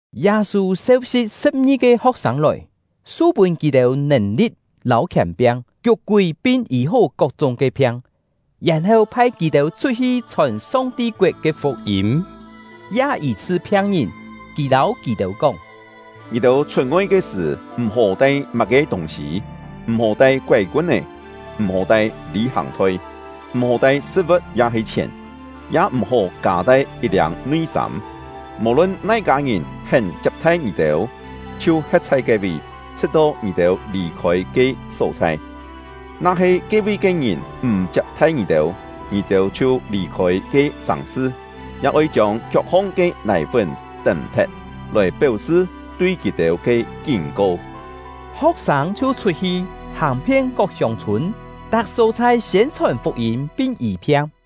Yâ-sû seu-si̍p sṳ̍p-ngi-ke ho̍k-sâng lòi, su-pûn kì-têu nèn-li̍t lâu khièn-piang, kiuk-kúi pin yî-hó kok-chúng ke phiang, yèn-heu phai kì-têu chhut-hi chhòn Song-ti koet ke fuk-yîm, ya yî-chhṳ phiang-ngìn. Kì lâu kì-têu kóng: “Ngì-têu chhut-ngoi ke sṳ̀, m̀-hó tai má-ke tûng-sî: M̀-hó tai koái-kun-é, m̀-hó tai lî-hàng-thoi, m̀-hó tai sṳ̍t-vu̍t ya-he chhièn, ya m̀-hó kâ-tai yit-liâng nui-sâm. Mò-lun nai-kâ ngìn hén chiap-thai ngì-têu, chhiu he̍t chhai ke-vi, chhṳ̍t-to ngì-têu lì-khôi ke só-chhai. Na-he ke-vi ke ngìn m̀ chiap-thai ngì-têu, ngì-têu chhiu lì-khôi ke sàng-sṳ, ya oi chiông kiok-hong ke nài-fún tém-thet, lòi péu-sṳ tui kì-têu ke kín-ko.” Ho̍k-sâng chhiu chhut-hi, hàng-phien kok hiông-chhûn, tak só-chhai siên-chhòn fuk-yîm pin yî-phiang.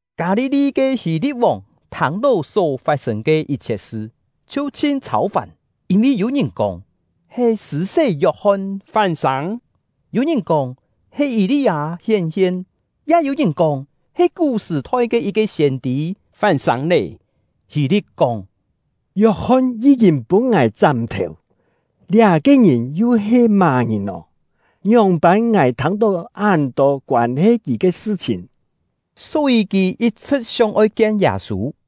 Kâ-li-li ke Hî-li̍t-vòng thâng-tó só fat-sên ke yit-chhiet sṳ, chhiu chhin chhâu-fàn; yîn-vi yû-ngìn kóng, he Sṳ̂-sé Yok-hon fán-sâng; yû-ngìn kóng, he Yî-li-â hién-hien; ya yû-ngìn kóng, he kú-sṳ̀-thoi ke yit-ke siên-tî fán-sâng lé. Hî-li̍t kóng: “Yok-hon yí-kîn pûn ngài chám-thèu, liá-ke ngìn yu he má-ngìn nò? Ngióng-pân ngài thâng-tó án-tô koân-he kì ke sṳ-chhìn?” Só-yî kì yit-chhṳ̍t sióng-oi kien Yâ-sû.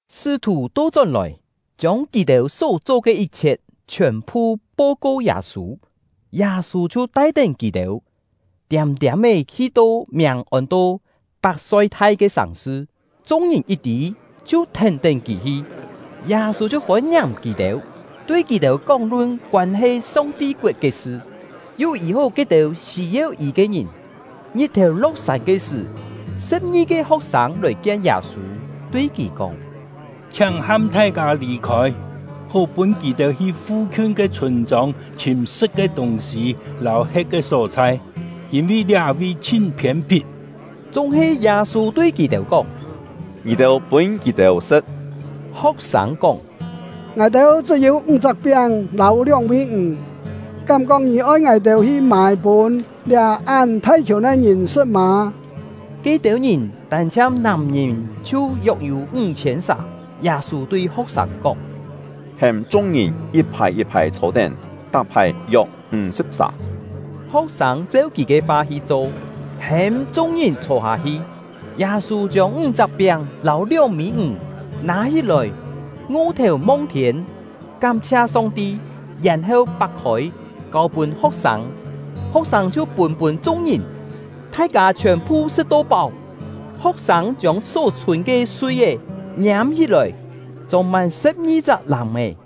Sṳ́-thù to-chón-lòi, chiông kì-têu só cho ke yit-chhiet chhiòn-phu po-ko Yâ-sû. Yâ-sû chhiu tai-tén kì-têu, tiâm-tiâm-é hi-to miàng ôn-to Pak-soi-thai ke sàng-sṳ. Chung-ngìn yit tî, chhiu thèn-tén kì hi. Yâ-sû chhiu fôn-ngiàng kì-têu, tui kì-têu kóng-lun koân-he Song-ti koet ke sṳ, yu yî-hó ke-têu sî-yeu yî ke ngìn. Ngit-thèu lo̍k-sân ke sṳ̀, sṳ̍p-ngi-ke ho̍k-sâng lòi kien Yâ-sû, tui kì kóng: “Chhiáng ham thai-kâ lì-khôi, hó pûn kì-têu hi fu-khiun ke chhûn-chông chhìm sṳ̍t ke tûng-sî lâu he̍t ke só-chhai, yîn-vi liá-vi chhin phiên-phit.” Chúng-he Yâ-sû tui kì-têu kóng: “Ngì-têu pûn kì-têu sṳ̍t!” Ho̍k-sâng kóng: “Ngài-têu chṳ́-yû ńg-chak piáng lâu lióng-mî ǹg. Kám-kóng ngì oi ngài-têu hi mâi pûn liá án thai-khiùn ke ngìn sṳ̍t mâ?” (Ke-têu ngìn, tân-chhiang nàm-ngìn chhiu yok-yû ńg-chhiên sà.) Yâ-sû tui ho̍k-sâng kóng: “Hêm chung-ngìn yit-phài yit-phài chhô-tén, tak-phài yok ńg-sṳ̍p-sà.” Ho̍k-sâng cheu kì ke fa hi cho, hêm chung-ngìn chhô-hâ-hi. Yâ-sû chiông ńg-chak piáng lâu lióng-mî ǹg nâ-hí-lòi, ngo-thèu mong-thiên, kám-chhia Song-ti, yèn-heu pak-khôi, kâu-pûn ho̍k-sâng; ho̍k-sâng chhiu pûn-pûn chung-ngìn. Thai-kâ chhiòn-phu sṳ̍t-to páu; ho̍k-sâng chiông só chhûn ke sui-é ngiâm-hí-lòi, chông-mân sṳ̍p-ngi-chak làm-è.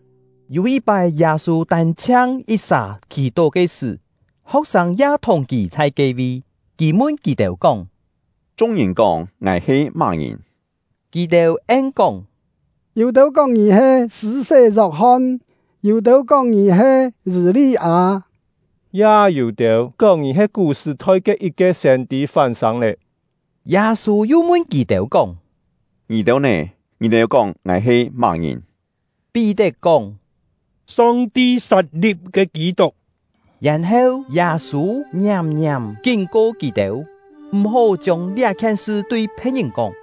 Yû yit-pái, Yâ-sû tân-chhiang yit-sà khì-tó ke sṳ̀, ho̍k-sâng ya thùng kì chhai ke-vi. Kì mun kì-têu kóng: “Chung-ngìn kóng ngài he má-ngìn?” Kì-têu en-kóng: “Yû-têu kóng ngì he Sṳ̂-sé Yok-hon; yû-têu kóng ngì he Yî-li-â; ya yû-têu kóng ngì he kú-sṳ̀-thoi ke yit-ke siên-tî fán-sâng lé.” Yâ-sû yu mun kì-têu kóng: “Ngì-têu nè? Ngì-têu kóng ngài he má-ngìn?” Pí-tet kóng: “Song-ti sat-li̍p ke Kî-tuk!” Yèn-heu, Yâ-sû ngiàm-ngiàm kín-ko kì-têu, m̀-hó chiông liá-khien sṳ tui phe̍t-ngìn kóng.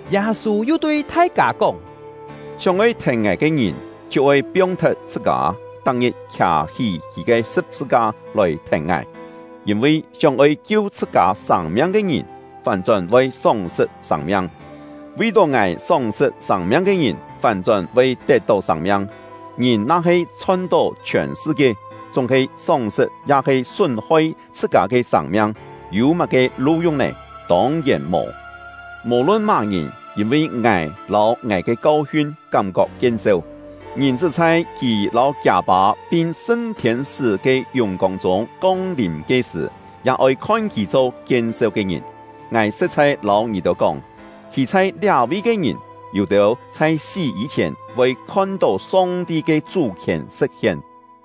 Yâ-sû yu tui thai-kâ kóng: “Sióng-oi thèn ngài ke ngìn, chhiu oi piong-thet chhṳ-kâ, tak-ngit khià-hí kì ke sṳ̍p-sṳ-ka lòi thèn ngài. Yîn-vi sióng-oi kiu chhṳ-kâ sâng-miang ke ngìn, fán-chón voi sóng-sṳt sâng-miang; vi-tó ngài sóng-sṳt sâng-miang ke ngìn, fán-chón voi tet-tó sâng-miang. Ngìn na-he chhon-tó chhiòn sṳ-kie, chúng-he sóng-sṳt ya-he sún-hoi chhṳ-kâ ke sâng-miang, yû má-ke lu-yung nè? Tông-yèn mò! Mò-lun má-ngìn, yîn-vi ngài lâu ngài ke kau-hiun kám-kok kien-seu, Ngìn-chṳ́ chhai kì lâu kiâ Pâ pin sṳn thiên-sṳ́ ke yùng-kông chûng kong-lìm ke-sṳ̀, ya oi khon kì cho kien-seu ke ngìn. Ngài sṳ̍t-chhai lâu ngì-têu kóng, khî chhai liá-vi ke ngìn, yû-têu chhai sí yî-chhièn voi khon-tó Song-ti ke chú-khièn sṳ̍t-hien!”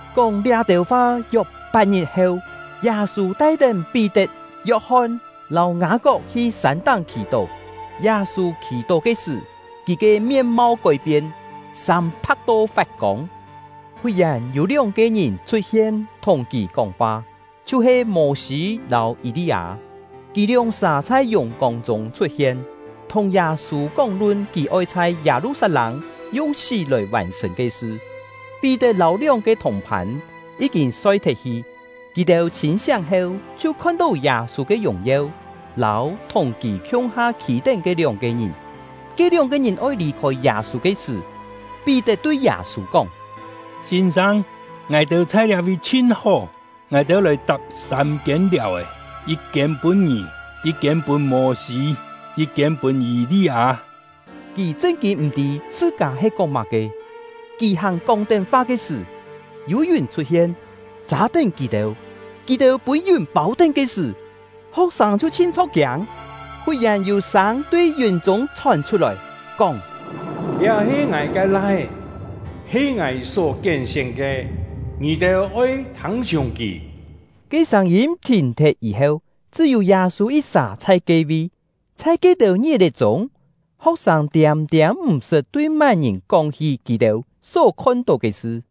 Kóng liá-têu fa yok pat-ngit heu, Yâ-sû tai-tén Pí-tet, Yok-hon lâu Ngâ-kok hi sân-táng khì-tó. Yâ-sû khì-tó ke sṳ̀, kì ke mien-mau kói-pien, sâm pha̍k-to fat-kông. Fut-yèn, yû lióng-ke ngìn chhut-hien thùng kì kóng-fa, chhiu-he Mô-sî lâu Yî-li-â. Kì lióng-sà chhai yùng-kông chûng chhut-hien, thùng Yâ-sû kóng-lun kì oi chhai Yâ-lu-sat-lâng yung sí lòi vàn-sṳ̀n ke sṳ. Pí-tet lâu lióng-ke thùng-phân yí-kîn soi-thet-hi; kì-têu chhîn-siáng heu, chhiu khon-tó Yâ-sû ke yùng-yeu lâu thùng kì khiung-ha khî-tén ke lióng-ke ngìn. Ke lióng-ke ngìn oi lì-khôi Yâ-sû ke sṳ̀, Pí-tet tui Yâ-sû kóng: “Sîn-sâng, ngài-têu chhai liá-vi chhin hó! Ngài-têu lòi tap sâm-kiên liàu-è, yit-kiên pûn ngì, yit-kiên pûn Mô-sî, yit-kiên pûn Yî-li-â.” (Kì chṳn-kîn m̀-tî chhṳ-kâ he kóng má-ke.) Kì hàn kóng-tén fa ke sṳ̀, yû yùn chhut-hien, châ-tén kì-têu. Kì-têu pûn yùn pâu-tén ke sṳ̀, ho̍k-sâng chhiu chhin chho̍k-kiâng. Fut-yèn yû sâng tui yùn-chûng chhòn chhut-lòi, kóng: “Liá he Ngài ke Lai-é, he Ngài só kién-sién ke. Ngì-têu oi thâng-chhiùng kì!” Ke sâng-yîm thìn-thet yî-heu, chṳ́-yû Yâ-sû yit-sà chhai ke-vi. Chhai ke-têu ngit-è chûng, ho̍k-sâng tiâm-tiâm m̀ sṳt tui má-ngìn kóng-hí kì-têu só khon-tó ke sṳ.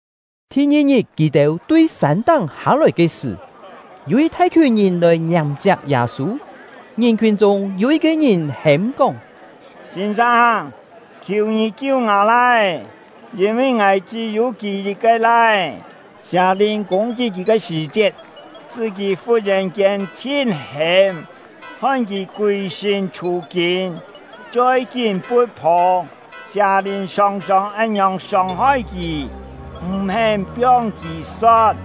Thi-ngi-ngit, kì-têu tui sân-táng hâ-lòi ke sṳ̀, yû yit thai-khiùn ngìn lòi ngiàng-chiap Yâ-sû. Ngìn-khiùn chûng, yû yit-ke ngìn hêm-kóng: “Sîn-sâng, khiù ngì kiu ngâ lai-é, yîn-vi ngài chṳ́-yû kì yit-ke lai-é! Sià-lìn kûng-kit kì ke sṳ̀-chiet, sṳ́ kì fut-yèn-kiên chhin hêm, hoi kì kûi-sṳ̂n chhû-kîn, choi kín pu̍t-phô. Sià-lìn sòng-sòng án-ngiòng sông-hoi kì, m̀-hén piong kì so̍t!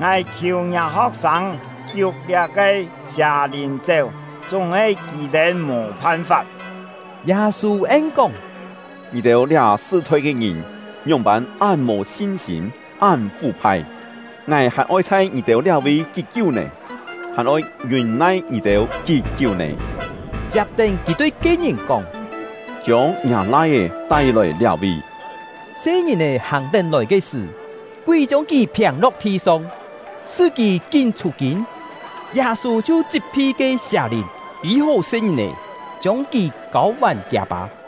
Ngài khiù ngiâ ho̍k-sâng kiuk liá-ke sià-lìn chéu, chúng-he kì-têu mò phan-fap.” Yâ-sû en-kóng: “Ngì-têu liá sṳ-thoi ke ngìn ngióng-pân án mò sin-sîm, án fú-phai! Ngài hàn oi chhai ngì-têu liá-vi kí-kiú nè? Hàn oi ngiûn-nai ngì-têu kí-kiú nè?” Chiap-tén, kì tui ke-ngìn kóng: “Chiông ngiâ lai-é tai-lòi liá-vi!” Se-ngìn-è hàng-tén lòi ke sṳ̀, kúi chiông kì phiâng-lo̍k thi-song, sṳ́ kì kín chhû-kîn. Yâ-sû chhiu chit-phi ke sià-lìn, yî-hó se-ngìn-è, chiông kì kâu-vàn kiâ-pâ.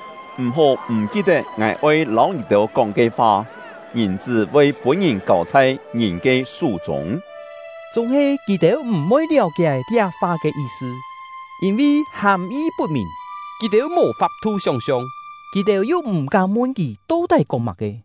“M̀-hó m̀ ki-tet ngài oi lâu ngì-têu kóng ke fa: Ngìn-chṳ́ voi pûn-ngìn kâu chhai ngìn ke sú-chûng.” Chúng-he kì-têu m̀-voi liáu-kié liá fa ke yi-sṳ; yîn-vi hàm-yi put-mìn, kì-têu mò fap-thu sióng-siong. Kì-têu yu m̀-kám mun kì to-tái kóng má-ke.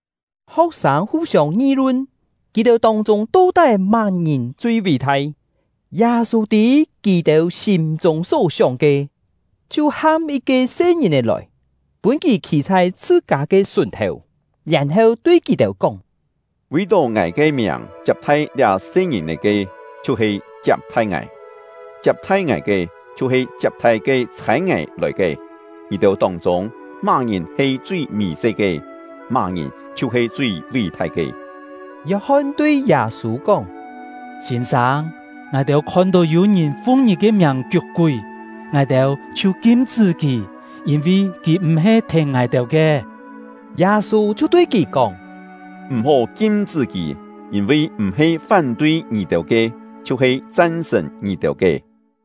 Ho̍k-sâng fu-siông ngi-lun, kì-têu tông-chûng to-tái má-ngìn chui ví-thai. Yâ-sû tî kì-têu sîm-chûng só-sióng ke, chhiu ham yit-ke se-ngìn-è lòi, pûn kì khî chhai chhṳ-kâ ke sùn-thèu, yèn-heu tui kì-têu kóng: “Vi-tó ngài ke miàng chiap-thai liá se-ngìn-è ke, chhiu-he chiap-thai ngài; chiap-thai ngài ke, chhiu-he chiap-thai ke chhâi ngài lòi ke. Ngì-têu tông-chûng, má-ngìn he chui mì-se ke, má-ngìn chhiu-he chui ví-thai ke.” Yok-hon tui Yâ-sû kóng: “Sîn-sâng, ngài-têu khon-tó yû-ngìn fung ngì ke miàng kiuk-kúi, ngài-têu chhiu kim-chṳ́ kì, yîn-vi kì m̀-he thèn ngài-têu ke.” Yâ-sû chhiu tui kì kóng: “M̀-hó kim-chṳ́ kì, yîn-vi m̀-he fán-tui ngì-têu ke, chhiu-he chan-sṳ̀n ngì-têu ke.”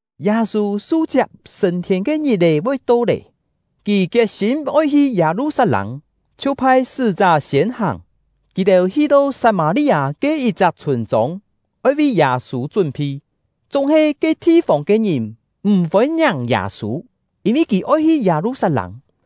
Yâ-sû su-chiap sṳ̂n-thiên ke ngit-è voi to lé, kì kiet-sîm oi hi Yâ-lu-sat-lâng, chhiu phai sṳ́-chá siên hàng. Kì-têu hi-to Sat-mâ-li-â ke yit-chak chhûn-chông, oi vi Yâ-sû chún-phi. Chúng-he ke thi-fông ke ngìn m̀ fôn-ngiàng Yâ-sû, yîn-vi kì oi hi Yâ-lu-sat-lâng.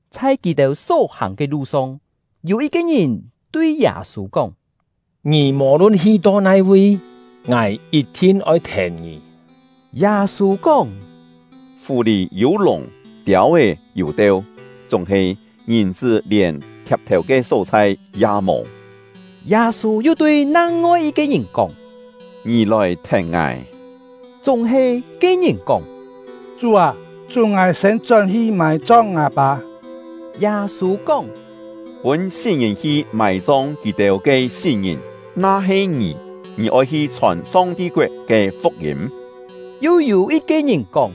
Chhai kì-têu só-hàng ke lu-song, yû yit-ke ngìn tui Yâ-sû kóng: “Ngì mò-lun hi-to nai-vi, ngài yit-thin oi thèn ngì.” Yâ-sû kóng: “Fù-lì yû lùng, tiâu-é yû teu, chúng-he Ngìn-chṳ́ lièn thiap-thèu ke só-chhai ya mò.” Yâ-sû yu tui nang-ngoi yit-ke ngìn kóng: “Ngì lòi thèn ngài.” Chúng-he ke-ngìn kóng: “Chú â, chún ngài siên chón-hi mài-chong ngâ-pâ.” Yâ-sû kóng: “Pûn sí-ngìn hi mài-chong kì-têu ke sí-ngìn! Na-he ngì, ngì oi hi chhòn Song-ti koet ke fuk-yîm.” Yu yû yit-ke ngìn kóng: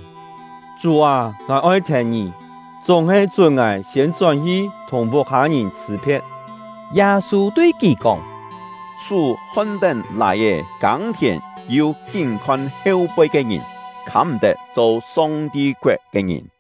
“Chú â, ngài oi thèn ngì, chúng-he chún ngài siên chón-hi thùng vuk-hâ-ngìn chhṳ̀-phe̍t.” Yâ-sû tui kì kóng: “Sú hon-tén lài-è kâng-thièn yu kín-khon heu-poi ke ngìn, khâm-m̀-tet cho Song-ti koet ke ngìn.”